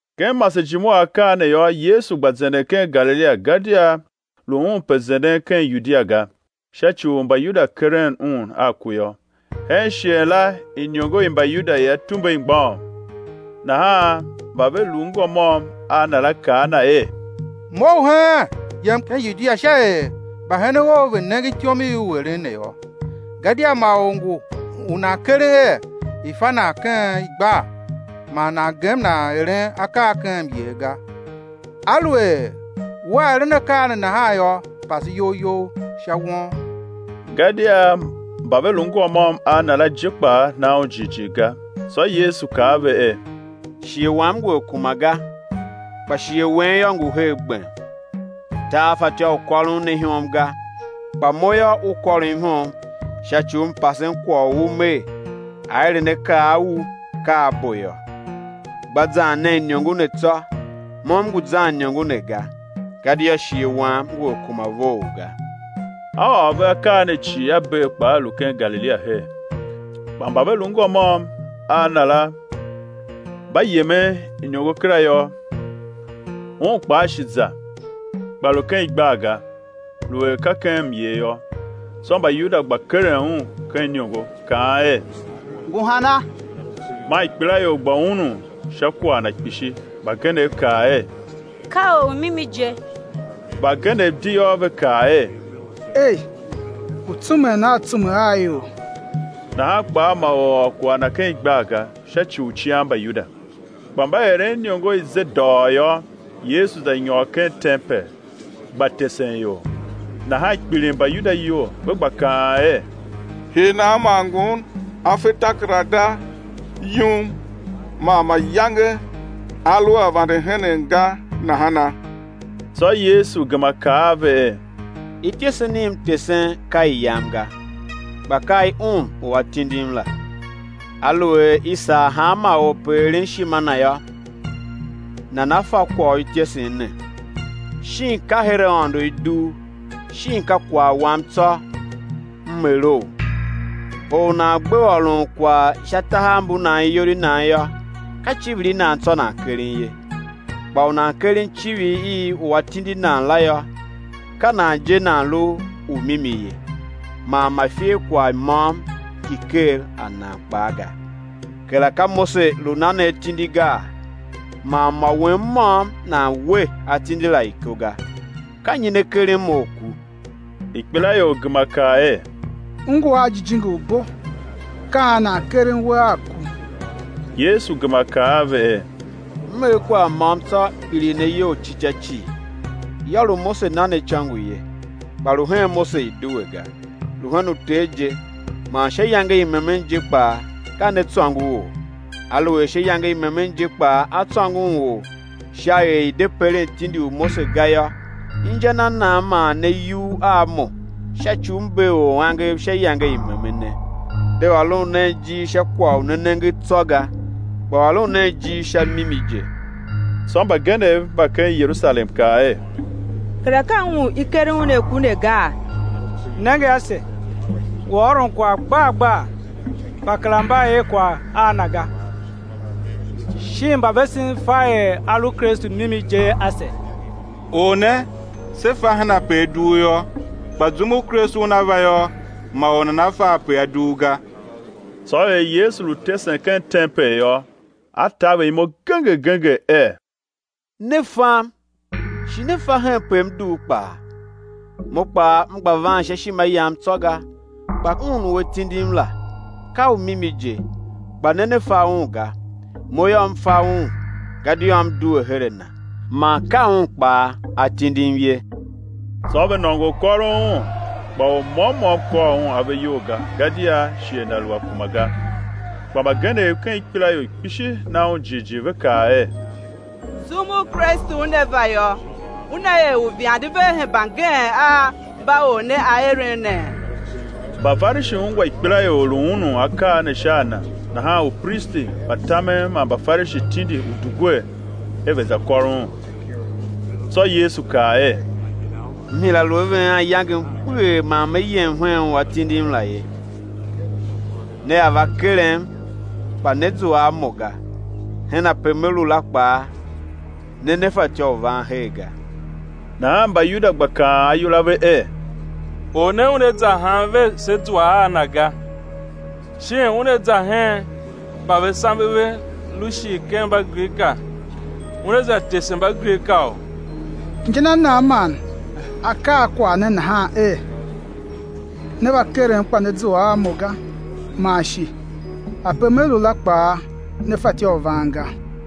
Ken masejime u akaa ne yô, Yesu gba zenden ken Galilia, gadia lu Un pe zenden ken Yudia ga, sha ci u Mbayuda keren Un a ku yô. Hen shighe la iniongo i Mbayuda i Atumbe i mgbôghom. Nahan mba ve lu ngô môm a Na la kaa a Na er: Mough heen, yem ken Yudia sha er mbahenen Ou ve̱ nenge ityom i U eren ne yô. Gadia ma or ngu u nan keren er i̱ fa nan ken igbar man nan gem nan eren akaa ken myer ga. Aluer Wea eren akaa ne nahan yô, pase iyol You sha won. Gadia mba ve lu ngô môm a Na la je kpaa na Un jighjigh ga. Tsô Yesu kaa a ve er: Shighe Wam ngu a kuma ga; kpa shighe wen yô, ngu her gbem. Tar fatyô u kôron ne ihom ga; kpa Mo yô, u kôrom ihom sha ci u M pasen kwagh u u Mer, aerenakaa a u ka a bo yô. Gba zan nen iniongo ne tsô, Mo M ngu zan iniongo ne ga, gadia shighe Wam ngu a kuma vough ga. A ôr ve akaa ne cii A bee kpa A lu ken Galilia her. Kpa mba ve lu ngô môm a Na la mba yemen iniongo kera yô, Un kpaa shi za, kpa lu ken igbar ga, lu er ka ken myer yô. Tsô Mbayuda gba keren Un ken iniongo, kaan er: Ngu hana? Man ikpelaior gba unun sha kwagh Na kpishi. Mbagenev kaa er: Ka ormimi je; mbagenev di yô, ve kaa er: Ei, ngu tsumen a tsume a ior. Nahan kpaa ma or ôr kwagh Na ken igbar ga, sha ci u cian Mbayuda. Kpa mba eren iniongo i ze dôghôô, Yesu za nyôr ken tempel, gba tesen ior. Nahan kpiligh Mbayuda iyol, ve gba kaan er: Hii nan man Ngun A fe takerada yum man mayange A lu a vande henen ga nahana? Tsô Yesu gema kaa a ve er: Ityesen i M tesen, ka i Yam ga, kpa ka i Un u A tindim la. Aluer i sar hanma or pe eren ishima Na yô, nana fa kwagh u ityesen ne, shin ka her Aôndo i dugh, shin ka kwagh Wam tsô M erou? Or u nan gbe ôron kwagh sha tahav mbu nan iyol i nan yô, ka icivir i nan tsô nan keren ye. Kpa u nan keren icivir i u a tindi nan la yô, ka nan je nan lu u mimi ye, man ma iferkwagh môm ngi ker a nan kpaa ga. Kera ka Mose lu na ne atindi gaa? man mô wen môm nan we atindi la iko ga. Ka nyi ne keren Mo a ku? Ikpelaior gema kaa er: U ngu a jijingi u bo, ka an nan keren We a ku? Yesu gema kaa a ve er: M er kwagh môm tsô, kpiligh ne iyol ci ca cii. Yô, lu Mose na ne icôngo ye, kpa lu hen Mose i due ga, lu hen uter je, man sha iyange i memen je kpaa ka ne tsôngo or. Aluer sha iyange i memen je kpaa a tsôngon or sha er i̱ de peren tindi u Mose ga yô, inja na nan man ne yugh a Mo sha ci u M bee or angev sha iyange i memene? De ôron nen ijir sha kwagh u ne nenge tsô ga, kpa ôron nen ijir sha mimi je. Tsô mbagenev mba ken Yerusalem kaa er: Kera ka Un u i keren Un a ku ne gaa? Nenge ase, ngu ôron kwagh gbar gbar, kpa kera mba er kwagh a Na ga, shin mbavesen fa er A lu Kristu mimi je ase? Or ne, se fa henpe A dugh yô, kpa zum u Kristu Una va yô, ma or nana fa ape A dugh ga. Tsô er Yesu lu tesen ken tempel yô, A taver imo genger genger er: Ne fam, shi ne fa henpe M dugh kpaa; Mo kpaa M gba van sha ishima Yam tsô ga, kpa Un u A tindim la, ka u mimi je, kpa ne ne fa Un ga. Mo yô, M fa Un; gadia M due her a Na, man ka Un kpaa A tindim ye. Tsô ve nôngo u kôron Un; kpa or môm môm kôr Un ave iyol ga gadia shighe Na lu a kuma ga. Kpa mbagenev ken ikpelaior kpishi na Un jighjigh, ve kaa er: Zum u Kristu Una va yô, Una er uivande vea hemba ngeen a mba Or ne A eren nee? Mbafarishi ungwa ikpelaior lu unun akaa ne sha a Na; nahan upristi mba tamen man Mbafarishi tindi udugwer er ve̱ za kôr Un. Tsô Yesu kaa er: M hira lu a ven anyangem kpeghee, man Me yem hen u A tindim la ye. Nea va kerem, kpa né zua a Mo ga; hen ape Me lu la kpaa, ne ne fatyô u van her ga. Nahan Mbayuda gba kaan ayol a ve er: Or ne Una za han ve sé zua a Na ga? Shin Una za hen mba ve sambe ve lu shir ken Mbagrika, Una za tese Mbagrikaou? Inja na nan man A kaa kwagh ne nahan er: Né va kerem kpa né zua a Mo ga, man shi: Ape Me lu la kpaa ne fatyô u van ga?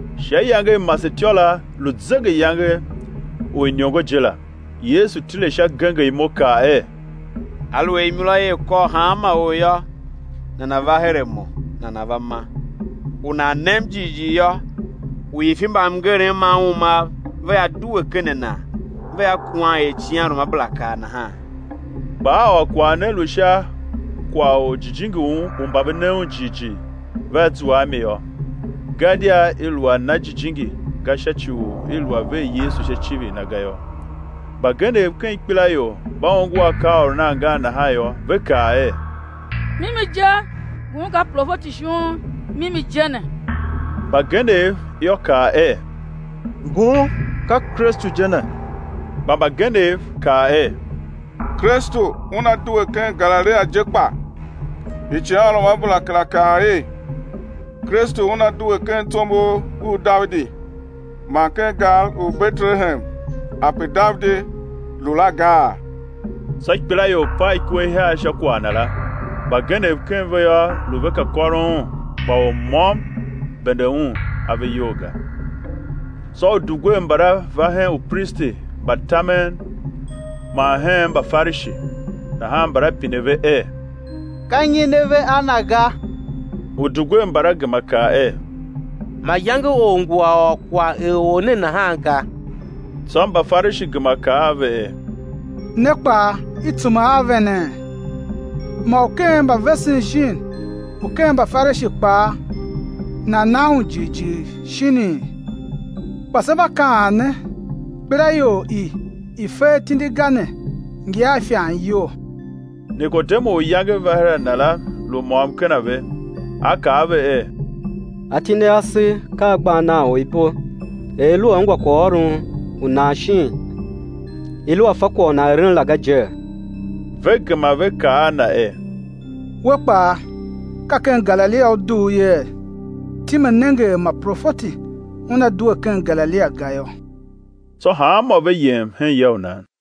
Sha iyange i masetyô la, lu zegeyange u iniongo je la, Yesu tile sha, genger imo kaa er: Aluer imura ia kôr hanma or yô, nana̱ va her a Mo, nana̱ va ma. U nan nem jighjigh yô, uifi mba mngerem ma umam vea due ken a nan vea kuwan er icighanruamabera kaa nahan. Kpa A ôr kwagh ne, lu sha kwagh u Jijingi u mba ve ne Un jighjigh vea zua a mi yô; gadia i lu a na Jijingi ga sha ci u i lu a ver Yesu sha icivir Na ga yô. Mbagenev ken ikpelaior mba ongo akaaôron angan nahan yô, ve kaa er: Mimi je, Ngun ka profeti shon mimi je ne. Mbagenev yô, kaa er: Ngun ka Kristu je ne. Kpa mbagenev kaa er: Kristu Una due ken Galilia je kpa? Icighanruamabera kera kaa er: Kristu Una due ken tsombor u Davidi man ken gar u Betelehem ape Davidi lu la gaa? Tsô ikpelaior pav ikwe ihiar sha kwagh Na la. Mbagenev ken ve yô, lu ve ka kôron Un, kpa or môm bende Un ave iyol ga. Tsô udugwer mbala va hen upristi mba tamen man hen Mbafarishi; nahan mbala pine ve er: Ka nyi ne ve a Na ga? Udugwer mbala gema kaa er: Mayange or ngu a ôr kwagh er Or ne nahan ga. Tsô Mbafarishi gema kaa a ve er: Ne kpaa i tsume a venee? Mô u ken mbavesen shin u ken Mbafarishi kpaa nan na Un jighjigh shinii? Kpa se mba kaan ne, ikpelaior i i fe atindi ga ne ngi a ifan iyol. Nikodemu u iyange va her a Na la, lu môm ken a ve, a kaa a ve er: Atindi ase ka a gba nan or ibo er i lu a ungwa kwaghôron u nan shin i lu a fa kwagh u nan eren la ga jee? Ve gema ve kaa a na er: We kpaa, ka ken Galilia u dugh yee? Time nenge er ma profeti una due ken Galilia ga yô. [ Tsô hanmô ve yem hen ya u nan.]